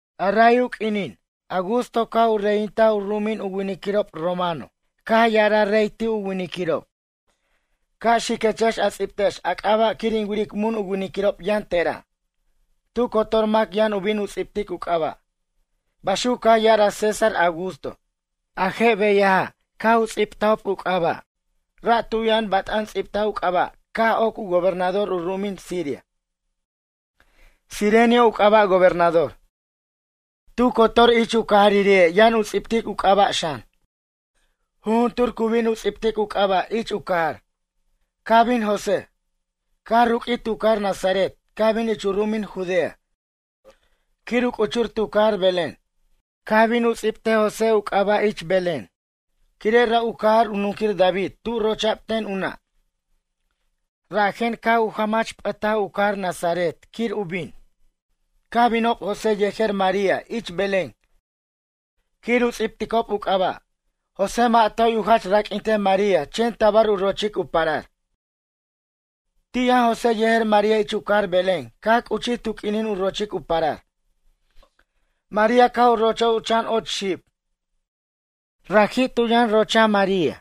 Ray u q'uinin Augusto caj u reyintaj u ru'umin u winiquirob romano caj ya'araj rey ti' u winiquirob: ―Ca' xiquechex a ts'ibtex a c'aba' quir in wiric mun u winiquirob yʌn tera'. Tu cotor mac yʌn u bin u ts'ibtic u c'aba'. Baxuc caj ya'araj César Augusto. A je' beyaja' caj u ts'ibtajob u c'aba'. Ra' tu yʌn bat'an ts'ibtaj u c'aba' caj oc u gobernador u ru'umin Siria, Cirenio, u c'aba' gobernador. Tu cotor ich u cajaririri'ej yʌn u ts'ibtic u c'aba' xan. Jujuntur cu bin u ts'ibtic u c'aba' ich u jach cajar. Caj bin José, caj ruq'uij ti' u cajar Nazaret caj bin ich u ru'umin Judea quir u c'uchur tu cajar Belén. Caj bin u ts'ibtej José u c'aba' ich Belén quire' ra' u cajar u nunquir David tu rocha'b ten u nʌ'. Rajen caj u jʌmʌch p'ʌtaj u cajar Nazaret quir u bin. Caj binob José yejer María ich Belén quir u ts'ibticob u c'aba'. José mʌ' toy u jach raq'uintej María chen tabar u rochic u parar. Ti' yʌn José yejer María ich u cajar Belén caj c'uchij tu q'uinin u rochic u parar. María caj u rochaj u chan och xib. Raji' tu yʌnx rochaj María.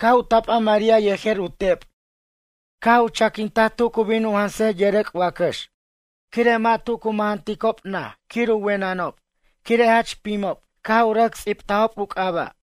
Caj u tapa María yejer u tep' caj u chaquintaj tu cu bin u jansej yʌrʌc' wacʌx quire' mʌ' tu cu mʌjʌnticob naj quir u wenʌnob quire' jach pimob caj u rʌc ts'ibtajob u c'aba'.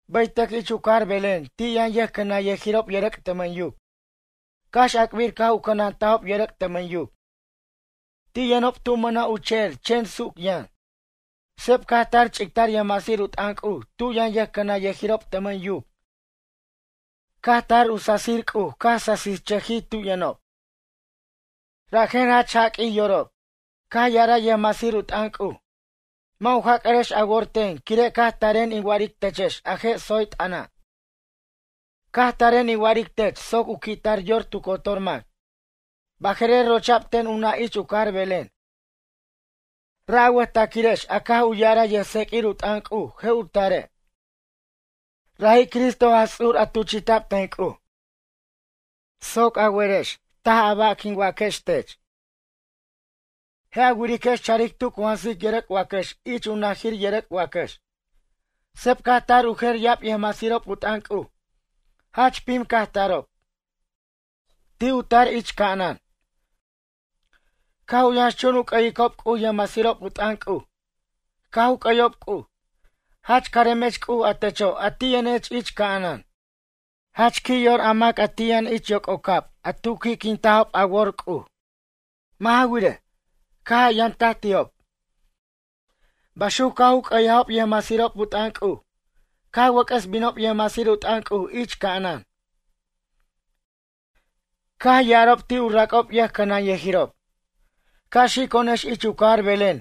Bʌytʌc ich u cajar Belén ti' yʌn yʌjcʌnanyʌjirob yʌrʌc' tʌmʌn yuc. Cax ac'bir caj u cʌnantajob yʌrʌc' tʌmʌn yuc. Ti' yʌnob tu mʌna' u che'er chen suc yʌn. Seb caj tar ch'ictar yʌjmasir u t'ʌn C'uj tu yʌn yʌjcʌnanyʌjirob tʌmʌn yuc caj tar u sasir C'uj caj sasichʌjij tu yʌnob. Rajen jach jaq'ui yorob. Caj ya'araj yʌjmasir u t'ʌn C'uj: ―Mʌ' u jac'ʌrex a worex ten quire' caj taren in wa'aric techex a je' tsoy t'ʌna'. Caj taren in wa'aric tech soc u qui'tar yor tu cotor mac. Baje'rer rocha'b ten u nʌ' ich u cajar Belén. Ra' a wʌjtaquirex a caj u ya'ara yʌjtseq'uir u t'ʌn C'uj je' u tare'. Raji' Cristo Jaj Ts'ur a' tuchi'ta'b ten C'uj. Soc a werex a ba' quin waquextech jaj. Je' a wiriquex charic tu cu jansic yʌrʌc' wacʌx ich u najir yʌrʌc' wacʌx. Seb caj tar u jer ya'ab yʌjmasirob u t'ʌn C'uj. Jach pim caj tarob. Ti' u tar ich ca'anan. Caj u yʌnxchun u c'ʌyicob C'uj yʌjmasirob u t'ʌn C'uj. Caj u c'ʌyob C'uj: Jach caremech C'uj a techo' a ti' yʌnech ich ca'anan. Jach qui' yor a mac a ti' yʌn ich yoc'ocab a tu qui' quiquintajob a wor C'uj. Mʌ' ja wirej, caj a yamtaj ti'ob. Baxuc caj c'ʌyajob yʌjmasirob u t'ʌn C'uj. Caj wʌc'ʌs binob yʌjmasir u t'ʌn C'uj ich ca'anan. Caj ya'arob ti' u rac'ob yʌjcʌnanyʌjirob: ―Ca' xico'onex ich u cajar Belén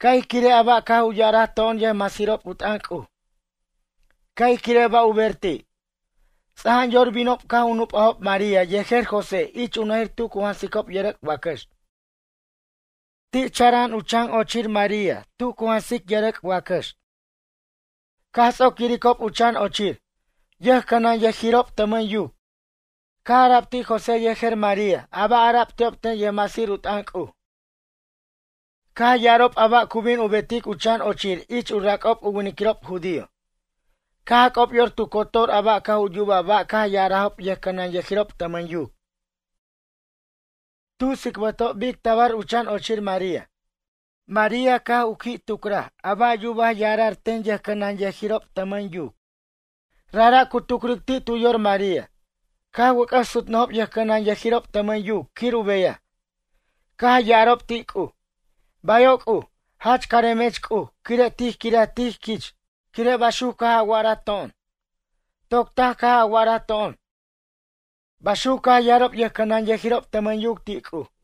ca' ij quirej a ba' caj u ya'araj to'on yʌjmasirob u t'ʌn C'uj. Ca' ij quirej ba' u ber ti'. Ts'ajan yor binob caj u nup'ajob María yejer José ich u najir tu cu jansicob yʌrʌc' wacʌx. Ti' chara'an u chan ochir María tu cu jansic yʌrʌc' wacʌx. Caj ts'oc yiricob u chan ochir. Yʌjcʌnanyʌjirob tʌmʌn yuc caj ara'b ti' José yejer María a ba' ara'b ti'ob ten yʌjmasir u t'ʌn C'uj. Caj ya'arob ba' cu bin u betic u chan ochir ich u rac'ob u winiquirob judío. Caj jac'ob yor tu cotor a caj u yuba ba' caj u ya'arajob yʌjcʌnanyʌjirob tʌmʌn yuc. Tu tsicbʌtob bic tabar u chan ochir María. María caj u qui' tucraj a ba' yuba ya'ara'r ten yʌjcʌnanyʌjirob tʌmʌn yuc. Rajra' cu tucric ti' tu yor María. Caj wʌc'ʌs sutnʌjob yʌjcʌnanyʌjirob tʌmʌn yuc quir u beyaj. Caj ya'arob ti' C'uj: ―Bayo' C'uj, jach caremech C'uj quire' tij quiraj tij quich quire' baxuc caj a wa'ara to'on. Toc taj caj a wa'araj to'on ―baxuc caj ya'arob yʌjcʌnanyʌjirob tʌmʌn yuc ti' C'uj.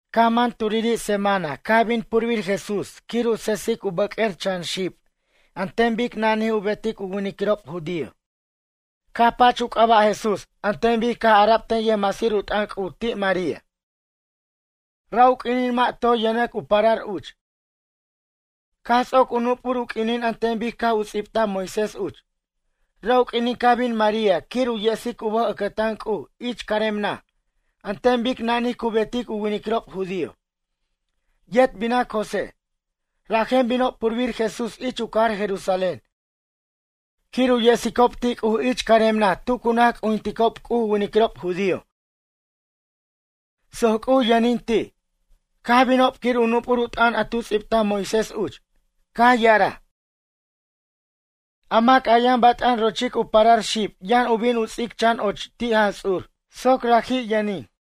Caj man turiri' semana caj bin purbir Jesús quir u sesic u bʌq'uer chan xib an ten bic nanij u betic u winiquirob judío. Caj pach u c'aba' Jesús an ten bic caj ara'b ten yʌjmasir u t'ʌn C'uj ti' María. Ra' u q'uinin mʌ' toy yʌnʌc u parar uch. Caj ts'oc u nup'ur u q'uinin an ten bic caj u ts'ibtaj Moisés uch. Ra' u q'uinin caj bin María quir u yesic u bʌj ʌcʌtan C'uj ich carem naj an ten bic nanij cu betic u winiquirob judío, yet binac José. Rajen binob purbir Jesús ich u cajar Jerusalén quir u yesicob ti' C'uj ich carem naj tu cu naj c'ujinticob C'uj u winiquirob judío soc C'uj yʌnin ti'. Caj binob quir u nup'ur u t'ʌn a tu ts'ibtaj Moisés uch. Caj ya'araj: “A mac a yʌn bat'an rochic u parar xib yʌn u bin u ts'ic chan och ti' Jaj Ts'urir soc raji' yʌnin.”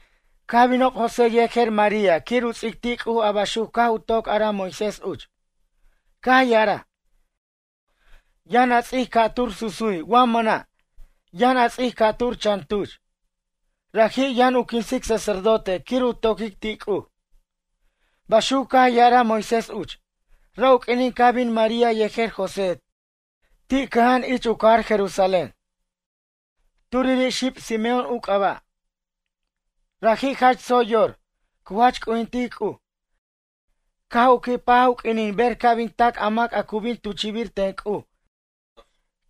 Caj binob José yejer María quir u ts'ic ti' C'uj a baxuc caj u toc araj Moisés uch, caj ya'araj: “Yʌn a ts'ic ca'tur susuy wa mʌna', yʌn a ts'ic ca'tur chan tuch. Raji' yʌn u quinsic sacerdote quir u toquic ti' C'uj.” Baxuc caj ya'araj Moisés uch. Ra' u q'uinin caj bin María yejer José ti' cʌja'an ich u cajar Jerusalén, turiri' xib Simeón u c'aba'. Raji' jach tsoy yor, cu jach c'ujintic C'uj. Caj u qui' paj u q'uinin ber ca' bin tac a mac a cu bin tuchi'bir ten C'uj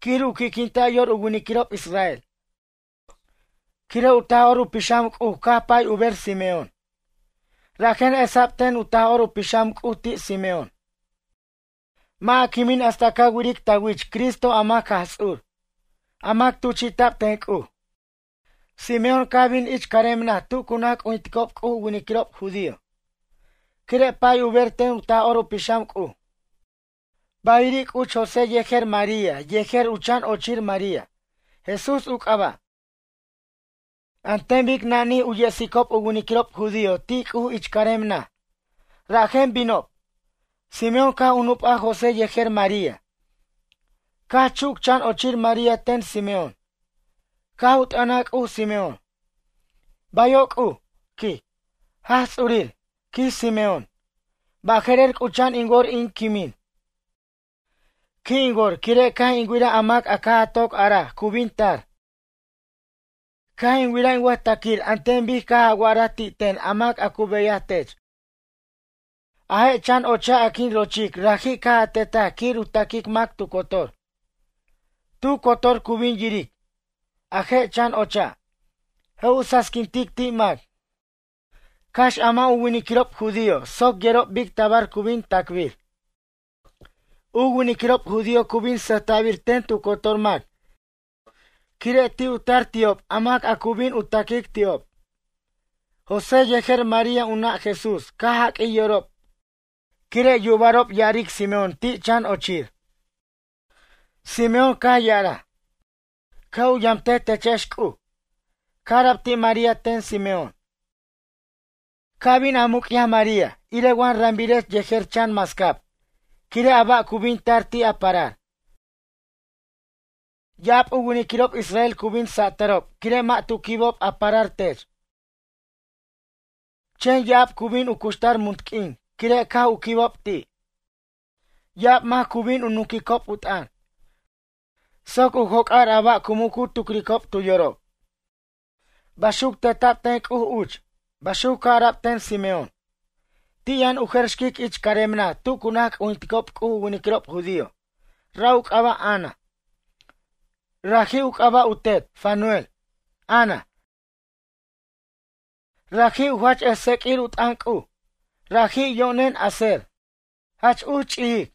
quir u qui'quinta' yor u winiquirob israel. Quire' u Taj'or u Pixam C'uj caj u pay ber Simeón. Rajen esa'b ten u Taj'or u Pixam C'uj ti' Simeón: “Mʌ' a quimin hasta ca wiric ta wich Cristo a mac Jaj Ts'ur, a mac tuchi'ta'b ten C'uj.” Simeón caj bin ich carem naj tu cu naj c'ujinticob C'uj u winiquirob judío, quire' pay u ber ten u Taj'or u Pixam C'uj. Ba'iri' c'uch José yejer María yejer u chan ochir María, Jesús u c'aba'. An ten bic nanij u yesicob u winiquirob judío ti' C'uj ich carem naj, rajen binob. Simeón caj u nup'aj José yejer María, caj chuc u chan ochir María ten Simeón. Caj u t'ʌnaj C'uj Simeón: Bayo' C'uj, quij. Jaj Ts'urir, quij Simeón, baje'rer c'ucha'an in wor in quimin. Qui' in wor quire' caj in wiraj a mac a caj a toc araj cu bin tar. Caj in wiraj in wʌjtaquir an ten bic caj a wa'araj ti' ten a mac a cu beyaj tech. A je' chan ocha' a quin rochic raji' caj a tetaj quir u taquic mac tu cotor. Tu cotor cu bin yiric. A je' chan ocha', je' u sasiquintic ti' mac cax a mʌ' u winiquirob judío soc yerob bic tabar cu bin tacbir. U winiquirob judío cu bin sʌjta'bir ten tu cotor mac quire' ti' u tar ti'ob a mac cu bin u taquic ti'ob. José yejer María u nʌ' Jesús caj jaq'uij yorob quire' yubarob ya'aric Simeón ti' chan ochir. Simeón caj ya'araj: ―Ca' u yamtej techex C'uj. Caj ara'b ti' María ten Simeón: ―Ca bin a muc'yaj María irej wa rambirech yejer chan mascab quire' a ba' cu bin tar ti' a parar. Ya'ab u winiquirob israel cu bin satʌrob quire' mʌ' tu quibob a parar tech. Chen ya'ab cu bin u cuxtar munt q'uin quire' caj u quibob ti'. Ya'ab mac cu bin u nunquicob u t'ʌn soc u joc'ar a ba' cu muc u tucricob tu yorob. Baxuc teta'b ten C'uj uch ―baxuc caj ara'b ten Simeón. Ti' yʌn u jer xquic ich carem naj tu cu naj c'ujinticob C'uj u winiquirob judío, ra' u c'aba' Ana, raji' u c'aba' u tet, Fanuel. Ana, raji' u jach ʌj tseq'uir u t'ʌn C'uj. Raji' yo'nen Aser. Jach uch ch'ijic.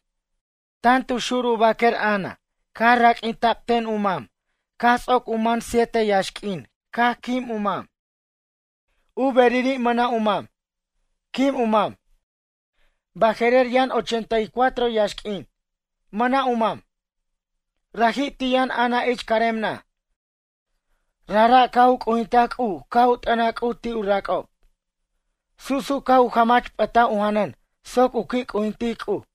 Tan tu xur u baquer Ana caj raq'uinta'b ten u mam caj ts'oc u man siete yaxq'uin caj quim u mam. U beriri' mʌna' u mam, quim u mam. Baje'rer yʌn ochenta y cuatro yaxq'uin, mʌna' u mam. Rajra' ti' yʌn Ana ich carem naj. Rajra' caj u c'ujintaj C'uj caj u t'ʌnaj C'uj ti' u rac'ob. Su' su' caj u jamach p'ʌtaj u janʌn soc u qui' c'ujintic C'uj.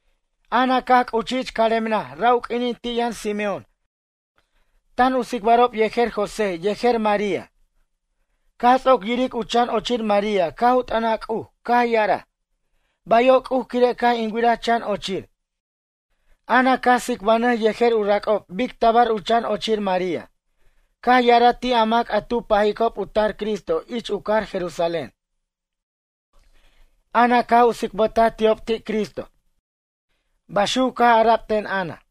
Ana caj c'uchij ich carem naj ra' u q'uinin ti' yʌn Simeón tan u tsicbarob yejer José yejer María. Caj ts'oc yiric u chan ochir María caj u t'ʌnaj C'uj caj ya'araj: ―Bayo' C'uj quire' caj in wiraj chan ochir. Ana caj tsicbanʌj yejer u rac'ob bic tabar u chan ochir María. Caj ya'araj ti' a mac tan u pajicob u tar Cristo ich u cajar Jerusalén. Ana caj u tsicbʌtaj ti'ob ti' Cristo. Baxuc caj ara'b ten Ana.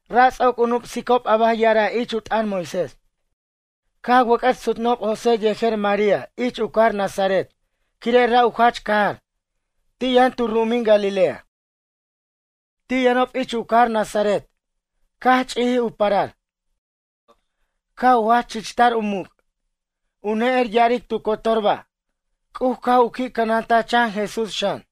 Ra' ts'oc u nup'sicob a ba' ya'araj ich u t'ʌn Moisés. Caj wʌc'ʌs sutnʌjob José yejer María ich u cajar Nazaret quire' ra' u jach cajar. Ti' yʌn tu ru'umin Galilea. Ti' yʌnob ich u cajar Nazaret caj ch'ijij u parar. Caj u jach chichtar u muc'. U ne'er ya'aric tu cotor ba'. C'uj caj u qui' cʌnantaj chan Jesús xan.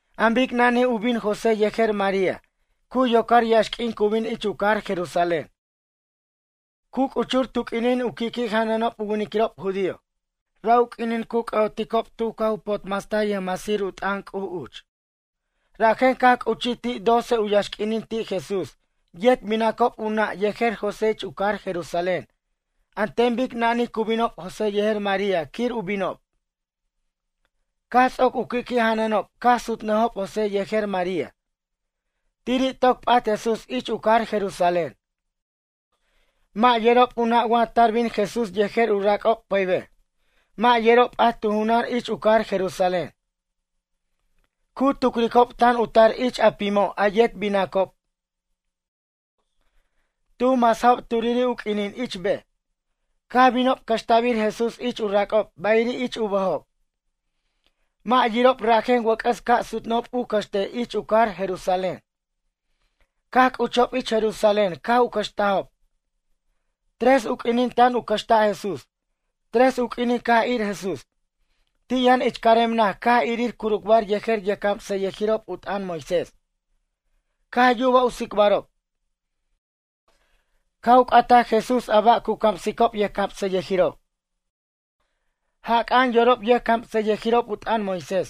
An bic nanij u bin José yejer María cu yocar yaxq'uin cu bin ich u cajar Jerusalén, cu c'uchur tu q'uinin u qui'qui' janʌnob u winiquirob judío. Ra' u q'uinin cu c'ʌ'oticob tu caj u potmastaj yʌjmasir u t'ʌn C'uj uch. Rajen caj c'uchij ti' doce u yaxq'uinin ti' Jesús yet binacob u nʌ' yejer José ich u cajar Jerusalén an ten bic nanij cu binob José yejer María quir u binob. Caj ts'oc u qui'qui' janʌnob caj sutnʌjob José yejer María. Tiri' toc p'at Jesús ich u cajar Jerusalén. Mʌ' yerob u nʌ' wa tar bin Jesús yejer u rac'ob pʌybej. Mʌ' yerob p'at tu junan ich u cajar Jerusalén. Cu tucricob tan u tar ich a pimo' a yet binacob, tu masajob turiri' u q'uinin ich bej. Caj binob cʌxta'bir Jesús ich u rac'ob bayiri' ich u bʌjob. Mʌ' yirob rajen wʌc'ʌs ca' sutnʌjob u cʌxtej ich u cajar Jerusalén. Caj c'uchob ich Jerusalén caj u cʌxtajob, tres u q'uinin tan u cʌxta' Jesús. Tres u q'uinin caj ir Jesús. Ti' yʌn ich carem naj caj irir curucbar yejer yʌjcamsʌyʌjirob u t'ʌn Moisés. Caj yubaj u tsicbarob. Caj u c'ataj Jesús a ba' cu camsicob yʌjcamsʌyʌjirob. Jac'a'an yorob yʌjcamsʌyʌjirob u t'ʌn Moisés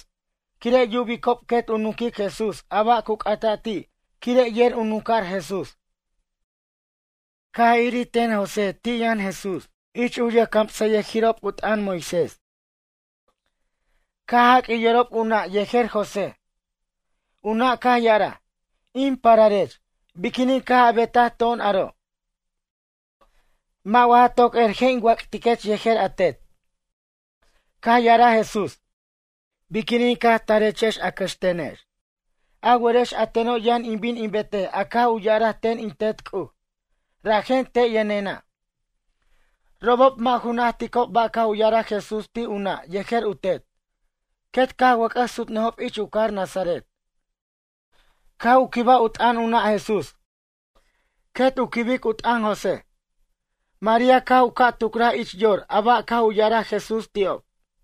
quire' yubicob quet u nunquic Jesús a ba' cu c'ata' ti' quire' yer u nunca'r Jesús. Caj irir ten José ti' yʌn Jesús ich u yʌjcamsʌyʌjirob u t'ʌn Moisés caj jaq'uij yorob u nʌ' yejer José. U nʌ' caj ya'araj: ―In pararech, biquinin caj a betaj to'on aro'? Mʌ' wa ja toc er je' in wac'tiquech yejer a tet? Caj ya'araj Jesús: ―Biquinin caj tarechex a cʌxtenex? A werex a teno' yʌn in bin in betej a caj u ya'araj ten in Tet C'uj, rajen te' yʌnena'. Robob mʌ' ju najticob ba' caj u ya'araj Jesús ti' u nʌ' yejer u tet. Quet caj wʌc'ʌs sutnʌjob ich u cajar Nazaret. Caj u quibaj u tʌn u nʌ' Jesús quet u quibic u t'ʌn José. María caj u caj tucraj ich yor a ba' caj u ya'araj Jesús ti'ob.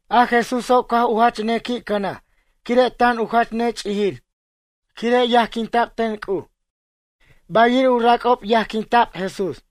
A Jesúso' caj u jach ne qui' cʌnaj quire' tan u jach ne ch'ijir quire' yajquinta'b ten C'uj. Bayiri' u rac'ob yajquinta'b Jesús.